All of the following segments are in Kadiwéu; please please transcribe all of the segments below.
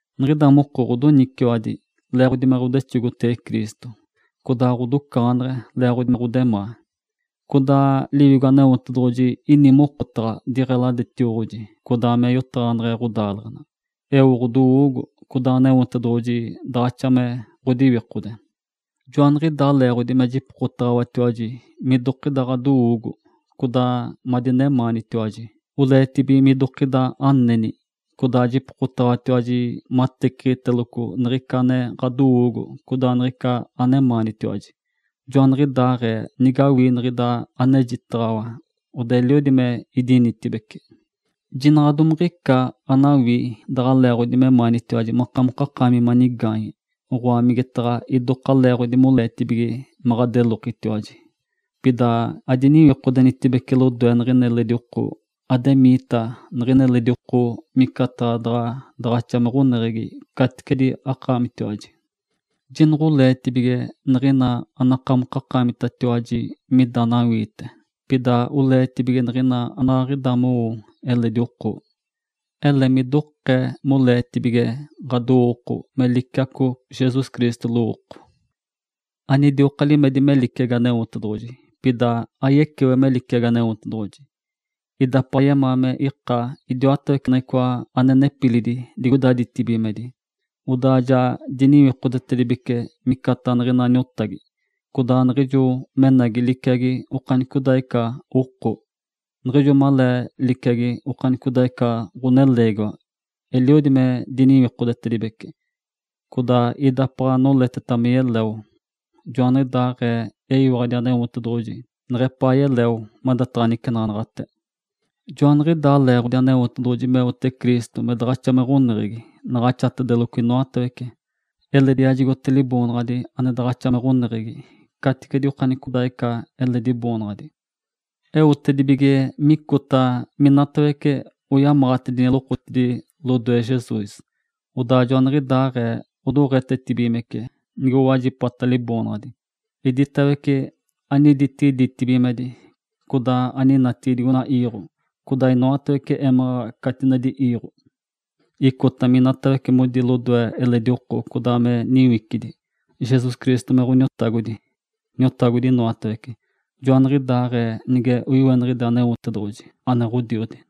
Niɡ̶ida moko ɡ̶odoniciwadi leeɡ̶odi me ɡ̶odexogotege Cristo, codaa ɡ̶odocaɡ̶aneɡ̶e leeɡ̶odi me ɡ̶odemaa, codaa Liwigo Aneotedoɡ̶oji ini mokotaɡ̶a diɡ̶eladetioɡ̶oji codaa me yotaɡ̶aneɡ̶e ɡ̶odaaleɡ̶ena, eo ɡ̶odowoogo, codaa Aneotedoɡ̶oji daɡ̶axa me ɡ̶odiwikode. Joaniɡ̶idaa leeɡ̶odi me jipokotaɡ̶awatiwaji midokida ɡ̶adowoogo, codaa madinemaanitiwaji oleetibige midokida aneni, codaa jipokotaɡ̶awatiwaji mateciɡ̶iteloco niɡ̶ica ane ɡ̶adowoogo codaa niɡ̶ica anemaanitiwaji. Joaniɡ̶idaaɡ̶ee nigawii niɡ̶ida anejitaɡ̶awa, odaa eliodi me idinitibeci. Jinaɡ̶a domaɡ̶a ica anawii daɡ̶a leeɡ̶odi memaanitiwaji akamokakaami manigaanye, oɡ̶oa, migetaɡ̶a idoka leeɡ̶odi moleetibige me ɡ̶adelokitiwaji. Pida adiniwikodenitibece lodoe niɡ̶ina eledi oko, ademiita niɡ̶ina eledi oko micataɡ̶a daɡ̶a daɡ̶axa me ɡ̶oneɡ̶egi caticedi akaamitiwaji. Jinoɡ̶oleetibige niɡ̶ina anakamokakaamitatiwaji mida anawiite, pida oleetibige niɡ̶ina anaɡ̶aɡ̶ida anowo eledi oko. Ele midokee moleetibige ɡ̶adowooko me liciaco Jesus Cristo lowooko. Anidioka limedi me liciagi Aneotedoɡ̶oji, pida ayecewe me liciagi Aneotedoɡ̶oji. Idapaɡ̶a yemaa me ika idiwatawece niɡ̶icoa ane nepilidi digoida ditibigimedi. Odaa ja diniwikodetedibece micataɡ̶a niɡ̶ina niotagi, codaa niɡ̶ijo menagi liciagi okanicodaaɡ̶ica oko. Niɡ̶ijo malee liciagi okanicodaaɡ̶ica ɡ̶oneleegiwa, eliodi me diniwikodetedibece, codaa idapaɡ̶a noleteta me yeleo, joaniɡ̶idaaɡ̶ee eyiwaɡ̶adi Aneotedoɡ̶oji neɡ̶epaa yeleo madataɡ̶a nicenaɡ̶anaɡ̶ate. Joaniɡ̶idaa leeɡ̶odi Aneotedoɡ̶oji meote Cristo me daɡ̶axa me ɡ̶oneɡ̶egi naɡ̶axatedeloco inoatawece, eledi yajigote Liboonaɡ̶adi ane daɡ̶axa me ɡ̶oneɡ̶egi caticedi okanicodaaɡ̶ica eledi boonaɡ̶adi. Eotedibige micota minatawece oyamaɡ̶atedini lokotidi lodoe Jesus, odaa joaniɡ̶idaaɡ̶ee odoɡ̶etetibigimece nigowajipata Liboonaɡ̶adi, iditawece aniditigi ditibigimedi, codaa aninatigi digoina iiɡ̶o, codaa minoatawece émaɡ̶aɡ̶a catinedi iiɡ̶o. Icota miditawece modi lodoe eledi oko codaa me niwicidi, Jesus Cristo me Ǥoniotagodi, Niotagodi inoatawece, joaniɡ̶idaaɡ̶ee nige oiweniɡ̶ide Aneotedoɡ̶oji ane Ǥodiodi.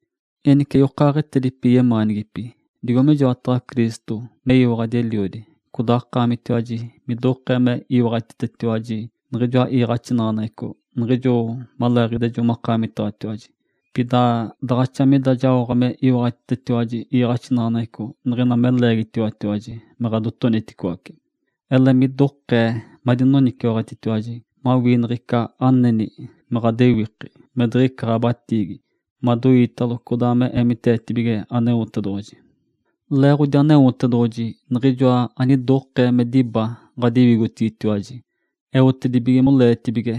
Enice yokaaɡ̶etedipi yemaanigipi, digo mijoataɡ̶a Cristo meyiwaɡ̶adi Eliodi, codaa akaamitiwaji midokee me iwaɡ̶atitetiwaji niɡ̶ijoa iiɡ̶axinaɡ̶aneɡ̶eco niɡ̶ijo maleeɡ̶idiaaɡ̶ejo makaamitaɡ̶atiwaji, pida daɡ̶axa mida jaoɡ̶a me iwaɡ̶atitetiwaji iiɡ̶axinaɡ̶aneɡ̶eco niɡ̶ina me leegitaɡ̶awatiwaji me ɡ̶adotoniticoace. Ele midokee madinoniciwaɡ̶atitiwaji mawii niɡ̶ica aneni me ɡ̶adewiki me diɡ̶icata ɡ̶abatiigi, madoiitalo, codaa me eemiteetigilo Aneotedoɡ̶oji. Leeɡ̶odi Aneotedoɡ̶oji Niɡ̶ijoa anidokee me diba ɡ̶adiwigotigitiwaji, eotedibige moleetibige,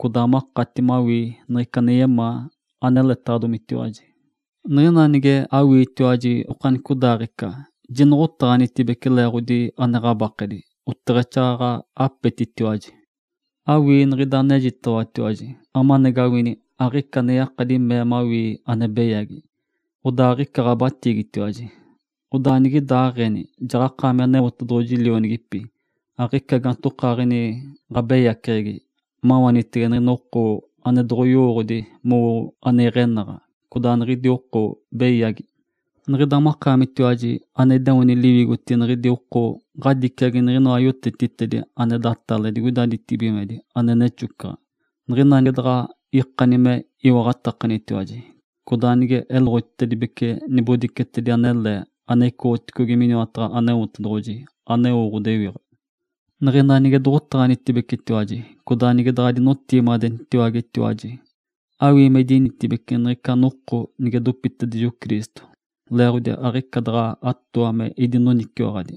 codaa makati mawii niɡ̶ica ane yemaa, aneletaɡ̶adomitiwaji. Niɡ̶ina nige awiitiwaji okanicodaaɡ̶ica, jinoɡ̶otaɡ̶anitibece leeɡ̶odi ane ɡ̶abakedi, oteɡ̶exaaɡ̶aɡ̶a apetitiwaji. Awii niɡ̶ida anejitaɡ̶awatiwaji amanagawini aɡ̶ica ane yakadi mee mawii ane beyagi, odaa aɡ̶ica ɡ̶abatiigitiwaji. Odaa nigidaaɡ̶eni jaɡ̶akaami Aneotedoɡ̶oji lionigipi, aɡ̶ica gaantokaaɡ̶ini ɡ̶abeyaceɡ̶egi, mawaanitege niɡ̶ina oko ane doɡ̶oyowooɡ̶odi mowote ane iɡ̶enaɡ̶a, codaa niɡ̶idi oko beyagi. Niɡ̶ida makaamitiwaji ane ideoni liwigotigi niɡ̶idi oko ɡ̶adiciagi niɡ̶inoa yotetitedi ane datale digoida ditibigimedi ane nexocaɡ̶a, niɡ̶ina nige daɡ̶a ikani me iwaɡ̶atakanitiwaji, codaa nige eloɡ̶otitedibece nibodicetedi anele ane icoɡ̶otedigi miniwataɡ̶a Aneotedoɡ̶oji, aneo ɡ̶odewiɡ̶a. Niɡ̶ina nige doɡ̶otaɡ̶anitibecetiwaji codaa nige daɡ̶adinotigimadenitatiwaji, awii me idinitibeci niɡ̶ica noko nige dopitedijo Cristo, leeɡ̶odi aɡ̶ica daɡ̶a atooa me idinoniciwaɡ̶adi,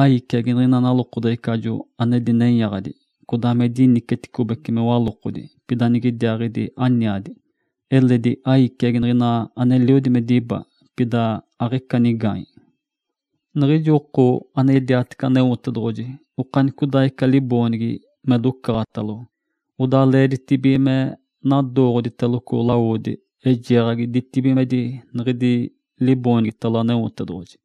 aiciagi niɡ̶ina nalokodeɡ̶ecajo ane dinenyaɡ̶adi, codaa me diniciticobece me walokodi, pida niɡ̶idiaaɡ̶idi aniadi, eledi aiciagi niɡ̶ina aneliodi me diba, pida aɡ̶ica nigaanye. Niɡ̶ijo oko ane yediatece Aneotedoɡ̶oji okanicodaaɡ̶ica liboonigi me docaɡ̶atalo, odaa leeditibige me nadooɡ̶oditeloco lawodi eijeeɡ̶agi ditibigimedi niɡ̶idi liboonigitalo Aneotedoɡ̶oji.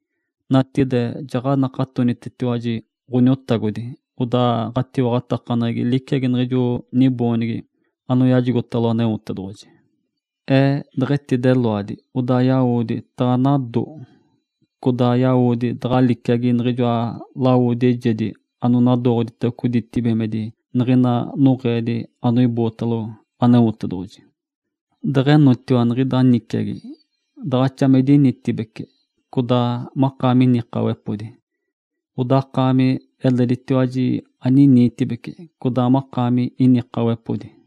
Natigide jaɡ̶anakatonitetiwaji Ǥoniotagodi, odaa ɡ̶atiwaɡ̶atakaneɡ̶egi liciagi niɡ̶ijo niboonigi anoyajigotalo Aneotedoɡ̶oji. Ee deɡ̶etideloadi, odaa yawodi taɡ̶anado. Codaa yawodi taɡ̶a liciagi niɡ̶ijoa lawodi eijedi ananadooɡ̶oditeloco ditibigimedi niɡ̶ina noɡ̶eedi anoibootalo Aneotedoɡ̶oji. Deɡ̶enotiwa niɡ̶ida niciagi, daɡ̶axa me idinitibeci, codaa makaami inikaɡ̶awepodi. Odaa akaami eleditiwaji aniniitibeci, codaa makaami inikaɡ̶awepodi.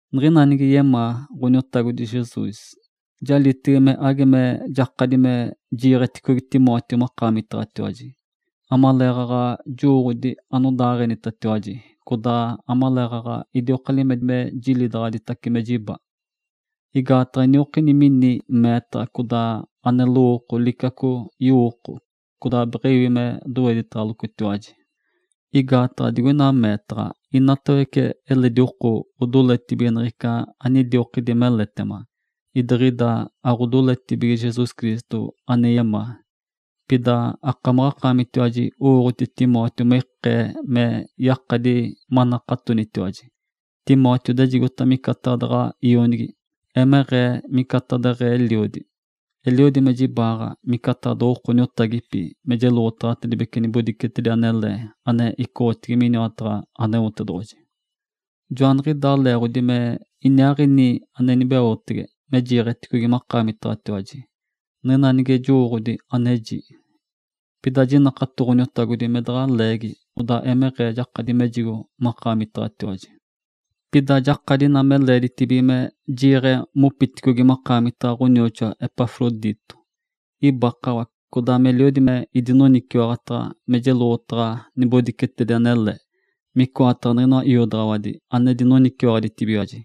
Niɡ̶ina nige yemaa Ǥoniotagodi Jesus, jalitege me age me jakadi me jiiɡ̶eticogi Timóteo makaamitaɡ̶atiwaji, amaleeɡ̶aɡ̶a jowooɡ̶odi anodaaɡ̶enitatiwaji, codaa amaleeɡ̶aɡ̶a idioka limedi me jilidaɡ̶aditace me jiba. Igaataɡ̶a iniokini mini meetaɡ̶a codaa ane lowooko liciaco yowooko, codaa beɡ̶ewi me doweditaɡ̶alocotiwaji. Igaataɡ̶a digoina meetaɡ̶a inatawece eledi oko odoletibige niɡ̶ica anidiokidi meletema, idiɡ̶ida aɡ̶odoletibige Jesus Cristo ane yemaa. Pida akamaɡ̶akaamitiwaji owooɡ̶oti Timóteo me ikee me yakadi manakatonitiwaji. Timóteo idejigota micataɡ̶a daɡ̶a ionigi, emeɡ̶ee micataɡ̶a deɡ̶ee eliodi. Eliodi me jibaaɡ̶a micataɡ̶a doɡ̶oko niotagipi me jeloɡ̶otaɡ̶atedibece nibodicetedi anele ane icoɡ̶otedigi miniwataɡ̶a Aneotedoɡ̶oji. Joaniɡ̶idaa leeɡ̶odi me niɡ̶iniaaɡ̶ini ane inibeotege me jiiɡ̶eticogi makaamitaɡ̶atiwaji, niɡ̶ina nige jowooɡ̶odi aneji. Pida jinakato Ǥoniotagodi me daɡ̶a leegi, odaa emeɡ̶eeta jakadi mejigo makaamitaɡ̶atiwaji. Pida jakadi ina me leeditibige me jiiɡ̶e mopiticogi makaamitaɡ̶atiwaji ɡ̶onioxoa Epafrodito. Ibakawa, codaa meliodi me idinoniciwaɡ̶ataɡ̶a me jeloɡ̶otaɡ̶a nibodicetedi anele, micoataɡ̶a niɡ̶inoa iodaɡ̶awadi ane dinoniciwaɡ̶aditibigiwaji.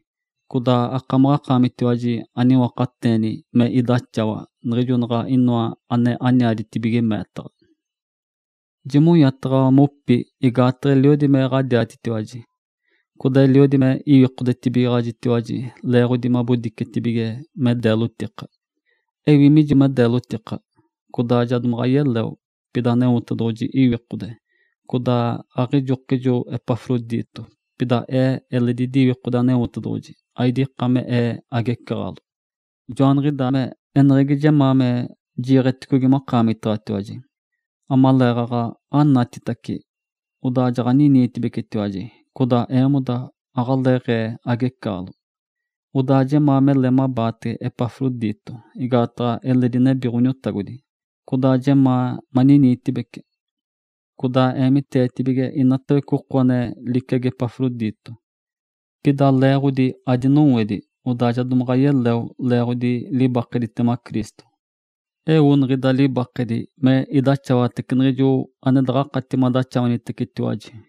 Codaa akamaɡ̶akaamitiwaji aniwakateeni me idaxawa, niɡ̶ijo naɡ̶a inoa ane aniaditibige meetaɡ̶a. Jimonya mopi igaataɡ̶a eliodi me ɡ̶adiatitiwaji, codaa eliodi me iwikodetibigaɡ̶ajitiwaji leeɡ̶odi mabodicetibige me deelotika. Ewi mijo me deelotika, codaa ja domaɡ̶a yeleo. Pida Aneotedoɡ̶oji iwikode, codaa aɡ̶ijokijo Epafrodito, pida ee eledi idiwikode Aneotedoɡ̶oji, aidika me ee agecaɡ̶alo. Joaniɡ̶idaa me eneɡ̶egi jemaa me jiiɡ̶eticogi makaamitaɡ̶atiwaji, amaleeɡ̶aɡ̶a anatitace, odaa jaɡ̶aniniitacibecitiwaji, codaa eemoda aɡ̶aleeɡ̶ee agecaɡ̶alo. Odaa jemaa mele mabaatege Epafrodito, igaataɡ̶a eledi nebi Ǥoniotagodi, codaa jemaa maniniitibecitiwaji. Codaa eemiteetibige inatawece oko ane liciagi Epafrodito. Pida leeɡ̶odi adinowedi, odaa ja domaɡ̶a yeleo leeɡ̶odi libakeditema Cristo. Eo niɡ̶ida libakedi me idaxawatece niɡ̶ijo ane daɡ̶akati madaxawanitecetiwaji.